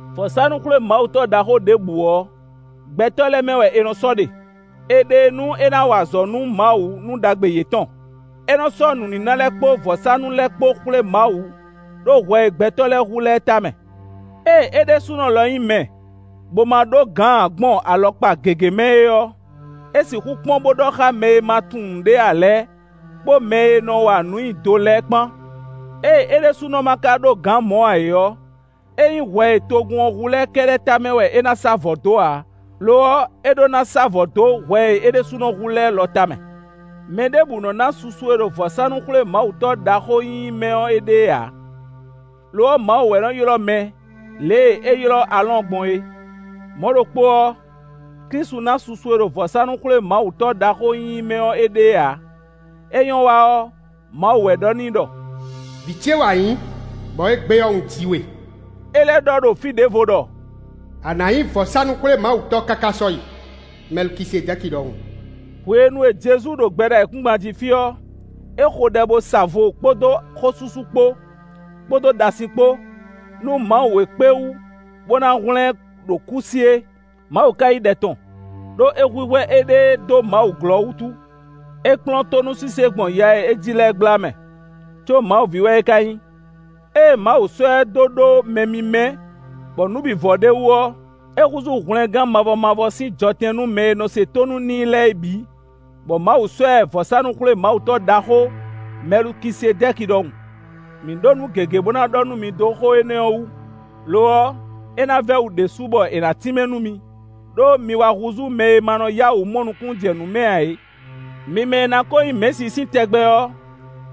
Vɔ̌sánú-xwlémawutɔ́ ɖaxó ɖěbǔ ɔ́, gbɛtɔ́ lɛ́ɛ mɛ wɛ è nɔ sɔ́ ɖe; è ɖe e nú é ná wa azɔ̌ nú Mawu nú ɖagbe yětɔn. É nɔ sɔ́ nǔníná lɛ́ɛ kpó vɔ̌sánú lɛ́ɛ kpó xwlé Mawu ɖó hwɛ e gbɛtɔ́ lɛ́ɛ hu lɛ́ɛ tamɛ. Ée é ɖésúnɔ lɔ nyí mɛ, bó ma ɖó gǎn ǎ gbɔn alɔkpa gěgé mɛ é ɔ́, é sixú kpɔ́n bó ɖɔ xá mɛ e ma tunwun nǔɖé ǎ lɛ́ɛ, kpó mɛ e nɔ wa nǔ nyi do lɛ́ɛ kpán. Ée é ɖésúnɔ ma ka ɖó gǎn mɔ̌ ǎ é ɔ́, é nyí hwɛ e togun ɔ́ hu lɛ́ɛ kɛ́ɖɛ́ tamɛ wɛ é ná sá vɔ̌ dó ǎ; lo ɔ́, é ɖó ná sá vɔ̌ dó hwɛ e é ɖésúnɔ hu lɛ́ɛ lɔ tamɛ. Mɛ ɖěbǔ nɔ na susu e ɖo vɔ̌sánú-xwlémawutɔ́ ɖaxó nyínyí mɛ ɔ́ éɖée ǎ; lo ɔ́, Mawu wɛ nɔ ylɔ́ mɛ lě e é ylɔ́ Aalɔ́ɔn gbɔn é. Mɔ̌ ɖokpó ɔ́, Klísu ná susu e ɖo vɔ̌sánú-xwlémawutɔ́ ɖaxó nyínyí mɛ ɔ́ éɖée ǎ; é nyɔ́ wa ɔ́, Mawu wɛ ɖɔ n'i ɖɔ: “Vǐ ce wɛ a nyǐ, bɔ égbé ɔ́, un ji we.” É lɛ́ ɖɔ ɖó fí ɖěvo ɖɔ: “A nǎ nyí vɔ̌sánú-xwlémawutɔ́ káká sɔ́yi, Mɛlukisedɛ́ki ɖɔhun.” Hwenu e Jezu ɖo gbɛ ɖo ayǐkúngban jí fí ɔ́, é xo ɖɛ bó sa vo kpódó xósúsú kpó, kpódó ɖasin kpó, nú Mawu e kpé wú bó ná hwlɛ́n ɛ ɖo kú sí é. Mawu ka yí ɖɛ tɔn, ɖó é hwíhwɛ́ éɖée dó Mawu glɔ́ wútu. É kplɔ́n tónúsise gbɔn ya e é ji lɛ́ɛ gbla mɛ, có Mawu ví wɛ é ka nyí. Ée Mawu sɔ́ ɛ dó ɖó mɛ mímɛ́ bɔ nǔ bǐ vɔ ɖ'é wú ɔ́, é húzú hwlɛngán mavɔ mavɔ sín jɔtɛn nú mɛ e nɔ se tónú n'i lɛ́ɛ é bǐ, bɔ Mawu sɔ́ ɛ vɔ̌sánú-xwlémawutɔ́ ɖaxó Mɛlukisedɛ́ki ɖɔhun. Mǐ ɖó nǔ gěgé bó ná ɖɔ nú mi dó xó énɛ́ ɔ́ wú; lo ɔ́, é ná vɛ́ wǔ ɖésú bɔ è nǎ tínmɛ nú mi, ɖó mi wá húzú mɛ e ma nɔ yá wǔ mɔ nukúnnú jɛ nǔ mɛ ǎ é. Mi mɛ e ná kó nyí mɛ̌si sín tɛgbɛ ɔ́,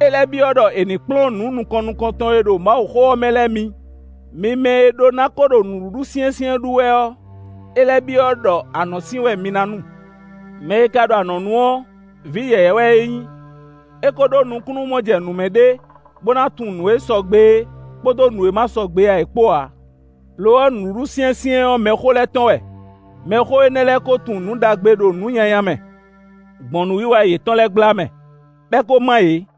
é lɛ́ byɔ́ ɖɔ è ní kplɔ́n nǔ nukɔn nukɔntɔn e ɖo Mawuxó ɔ́ mɛ lɛ́ɛ mi. Mi mɛ e ɖó ná ko ɖo nǔɖuɖu syɛ́nsyɛ́n ɖu wɛ ɔ́, é lɛ́ byɔ́ ɖɔ anɔ̌sin wɛ mi ná nu. Mɛ e ka ɖo anɔ̌nu ɔ́, vǐ yɛ̌yɛ́ wɛ é nyí; é ko ɖó nukúnnú-mɔjɛnǔmɛ ɖé bó ná tunwun nǔ e sɔgbe é, kpódó nǔ e ma sɔgbe ǎ é kpó ǎ. Lo ɔ́, nǔɖuɖu syɛ́nsyɛ́n ɔ́, mɛxó lɛ́ɛ tɔn wɛ; mɛxó énɛ́ lɛ́ɛ kó tunwun nǔ ɖagbe ɖo nǔ nyanya mɛ, gbɔn nǔwiwa yětɔn lɛ́ɛ gbla mɛ, bɔ é ko má yě.